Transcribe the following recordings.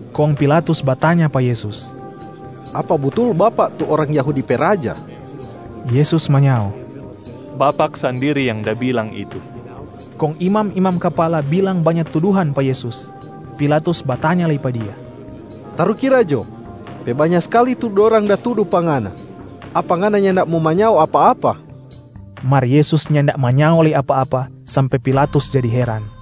Kong Pilatus batanya pa Yesus, “Apa butul Bapak tu orang Yahudi pe Raja?” Yesus manyao, “Bapak sandiri yang da bilang itu.” Kong imam-imam kapala bilang banya tuduhan pa Yesus. Pilatus batanya lei pa Dia, “Tarukira jo, pe banya skali tu dorang da tudu pa Ngana. Apa Ngana nyanda mo manyao apa-apa?” Mar Yesus nyanda manyao lei apa-apa sampe Pilatus jadi heran.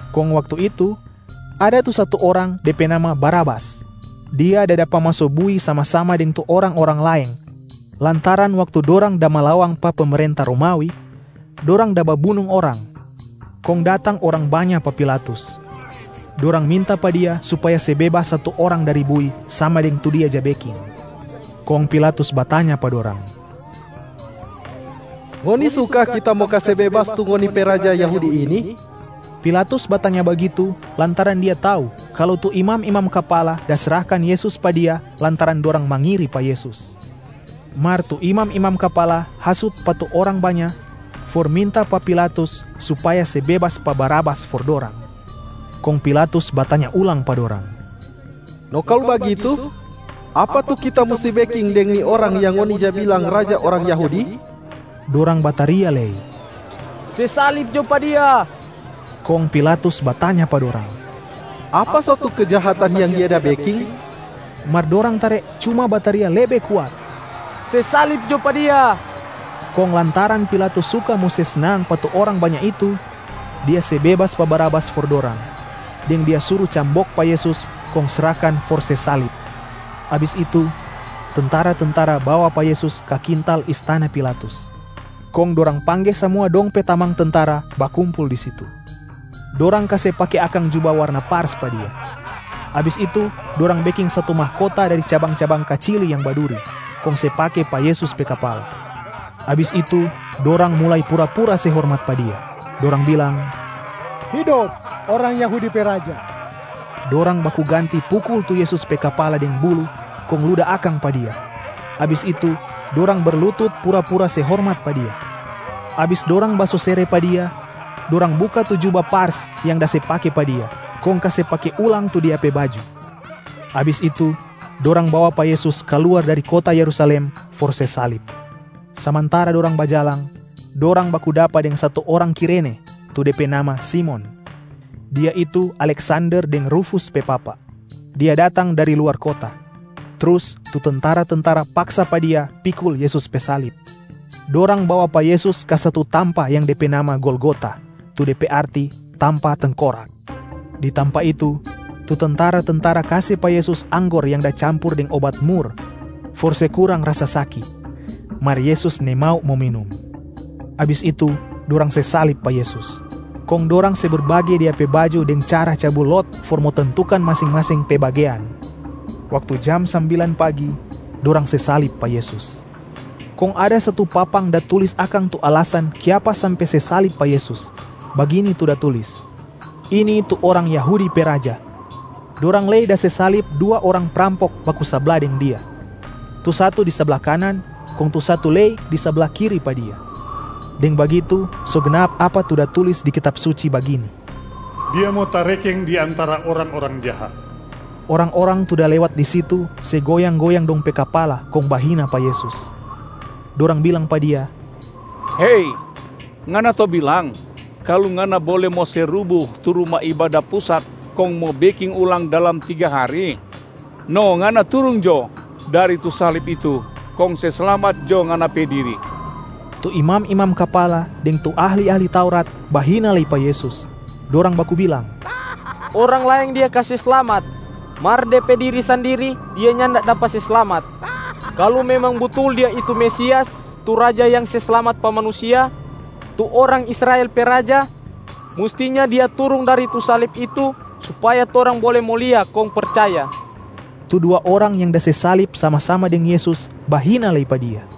Kong waktu itu, ada tu satu orang, de pe nama Barabas. Dia da dapa maso bui sama-sama deng tu orang-orang laeng, lantaran waktu dorang da malawang pa pemerenta Romawi, dorang da babunung orang. Kong datang orang banya pa Pilatus, dorang minta pa dia supaya se bebas satu orang dari bui sama deng tu dia ja beking. Kong Pilatus batanya pa dorang, “Ngoni suka kita mo kase bebas tu ngoni pe Raja Yahudi ini?” Pilatus batanya bagitu, lantaran dia tau kalu tu imam-imam kapala da srahkan Yesus pa dia lantaran dorang mangiri pa Yesus. Mar tu imam-imam kapala hasut pa tu orang banya for minta pa Pilatus supaya se bebas pa Barabas for dorang. Kong Pilatus batanya ulang pa dorang, “No kalu bagitu, apa tu kita musti beking deng ni orang yang ngoni ja bilang raja orang Yahudi?” Dorang bataria lei, “Se salib jo pa Dia!” Kong Pilatus batanya pa dorang, “Apa so tu kejahatan yang Dia da beking?” Mar dorang tare cuma bataria lebe kuat, “Se salib jo pa Dia!” Kong lantaran Pilatus suka mo se snang pa tu orang banya itu, dia se bebas pa Barabas for dorang, deng dia suru cambok pa Yesus kong srahkan for se salib. Abis itu, tentara-tentara bawa pa Yesus ka kintal istana Pilatus, kong dorang pangge samua dong pe tamang tentara bakumpul di situ. Dorang kase pake akang juba warna pars pa Dia. Abis itu dorang beking satu mahkota dari cabang-cabang kacili yang baduri, kong se pake pa Yesus pe kapala. Abis itu dorang mulai pura-pura se hormat pa Dia, dorang bilang, “Hidop orang Yahudi pe raja!” Dorang baku ganti pukul tu Yesus pe kapala deng buluh kong luda akang pa Dia. Abis itu dorang berlutut pura-pura se hormat pa Dia. Abis dorang basosere pa Dia, dorang buka tu juba pars yang da se pake pa Dia, kong kase pake ulang tu Dia pe baju. Yesus dapa salib Abis itu, dorang bawa pa Yesus kaluar dari kota Yerusalem for se salib. Samantara dorang bajalang, dorang baku dapa deng satu orang Kirene tu de pe nama Simon. Dia itu Aleksander deng Rufus pe papa. Dia datang dari luar kota. Trus tu tentara-tentara paksa pa dia pikul Yesus pe salib. Dorang bawa pa Yesus ka satu tampa yang de pe nama Golgota, tu de pe arti ‘Tampa Tengkorak’. Di tampa itu, tu tentara-tentara kase pa Yesus anggor yang da campur deng obat mur for se kurang rasa saki, mar Yesus nimau mo minum. Abis itu, dorang se salib pa Yesus, kong dorang se berbage Dia pe baju deng cara cabu lot for mo tentukan masing-masing pe bagean. Waktu jam sambilan pagi, dorang se salib pa Yesus. Kong ada satu papang da tulis akang tu alasan kiapa sampe se salib pa Yesus, bagini tu da tulis, “Ini tu orang Yahudi pe raja.” Dorang lei da se salib dua orang prampok baku sabla deng Dia, tu satu di sabla kanan kong tu satu lei di sabla kiri pa Dia. [ Deng bagitu, so gnap apa tu da tulis di Kitab Suci bagini, “Dia mo tarekeng di antara orang-orang jaha”.] Orang-orang tu da lewat di situ se goyang-goyang dong pe kapala kong bahina pa Yesus. Dorang bilang pa Dia, “Hei, Ngana to bilang kalu Ngana bole mo se rubu tu Ruma Ibada Pusat kong mo beking ulang dalam tiga hari? No Ngana turung jo dari tu salib itu kong se slamat jo Ngana pe diri!” Tu imam-imam kapala deng tu ahli-ahli Taurat bahina lei pa Yesus. Dorang baku bilang, “Orang laeng Dia kase slamat, mar De pe diri sandiri Dia nyanda dapa se slamat! Kalu memang butul Dia itu Mesias tu Raja yang se slamat pa manusia, tu orang Israel pe Raja, mustinya Dia turung dari tu salib itu supaya torang bole mo lia kong percaya.” Tu dua orang yang da se salib sama-sama deng Yesus bahina lei pa Dia.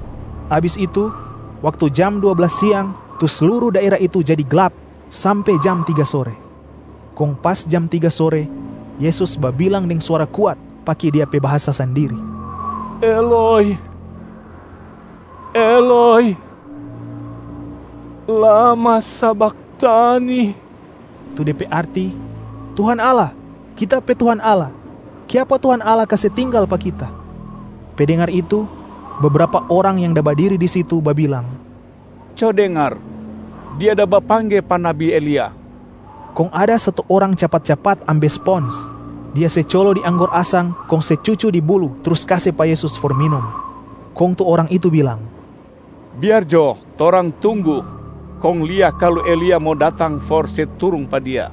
Abis itu, waktu jam dua blas siang tu sluru daera itu jadi glap sampe jam tiga sore. Kong pas jam tiga sore, Yesus babilang deng suara kuat pake Dia pe bahasa sandiria, “Eloi, Eloi lama sabakhtani?” tu de pe arti ‘Tuhan Allah, Kita pe Tuhan Allah, kiapa Tuhan Allah kase tinggal pa Kita?’ Pe dengar itu, bebrapa orang yang da badiri di situ babilang, “Co dengar, Dia da bapangge pa nabi Elia.” Kong ada satu orang capat-capat ambe spons, dia se colo di anggor asang kong se cucu di buluh trus kase pa Yesus for minum. Kong tu orang itu bilang, “Biar jo torang tunggu kong lia kalu Elia mo datang for se turung pa Dia.”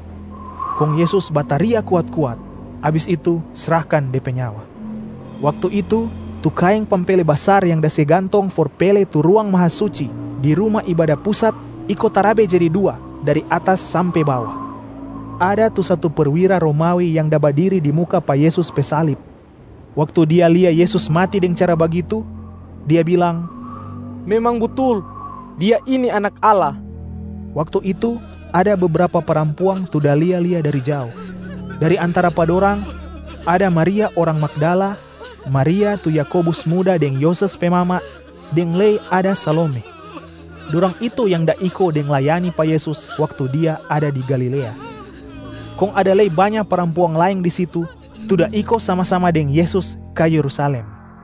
Kong Yesus bataria kuat-kuat, abis itu srahkan De pe nyawa. Waktu itu, tu kaeng pampele basar yang da se gantong for pele tu Ruang Mahasuci di Ruma Ibada Pusat iko tarabe jadi dua dari atas sampe bawa. Ada tu satu perwira Romawi yang da badiri di muka pa Yesus pe salib. Waktu dia lia Yesus mati deng cara bagitu, dia bilang, “Memang butul, Dia ini Anak Allah!” Waktu itu ada bebrapa parampuang tu da lia-lia dari jao. Dari antara pa dorang ada Maria orang Magdala, Maria tu Yakobus muda deng Yoses pe mama, deng lei ada Salome. Dorang itu yang da iko deng da layani pa Yesus waktu Dia ada di Galilea. Kong ada lei banya parampuang laeng di situ tu da iko sama-sama deng Yesus ka Yerusalem.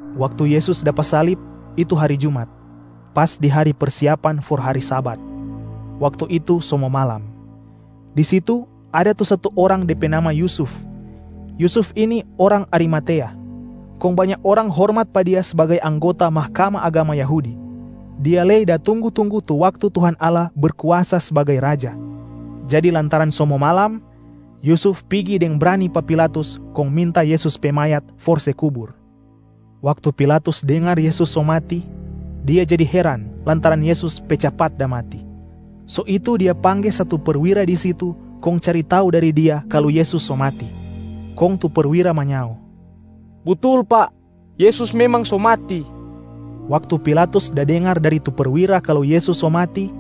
Waktu Yesus dapa salib itu hari jumat, pas di hari persiapan for hari Sabat. Waktu itu, so mo malam. Di situ ada tu satu orang de pe nama Yusuf. Yusuf ini orang Arimatea, kong banya orang hormat pa dia sbagai anggota Mahkamah Agama Yahudi. Dia lei da tunggu-tunggu tu waktu Tuhan Allah Berkuasa sbagai Raja. Jadi lantaran so mo malam, Yusuf pigi deng brani pa Pilatus kong minta Yesus pe mayat for se kubur. Waktu Pilatus dengar Yesus so mati, dia jadi heran lantaran Yesus pe capat da mati. So itu dia pangge satu perwira di situ kong cari tau dari dia kalu Yesus so mati. Kong tu perwira manyao, “Butul, pak. Yesus memang so mati.” Waktu Pilatus da dengar dari tu perwira kalu Yesus so mati,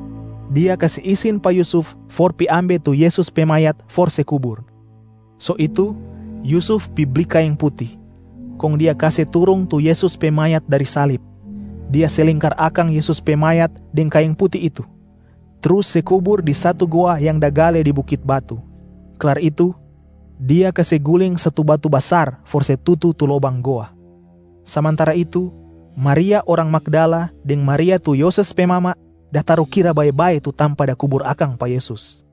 Dia kase isin pa Yusuf for pi ambe tu Yesus pe mayat for se kubur. So itu Yusuf pi bli kaeng puti, kong dia kase turung tu Yesus pe mayat dari salib, dia se lingkar akang Yesus pe mayat deng kaeng puti itu, trus se kubur di satu goa yang da gale di bukit batu. Klar itu, dia kase guling satu batu basar for se tutu tu lobang goa. Samantara itu, Maria orang Magdala deng Maria tu Yoses pe mama da tarukira bae-bae tu tampa da kubur akang pa Yesus.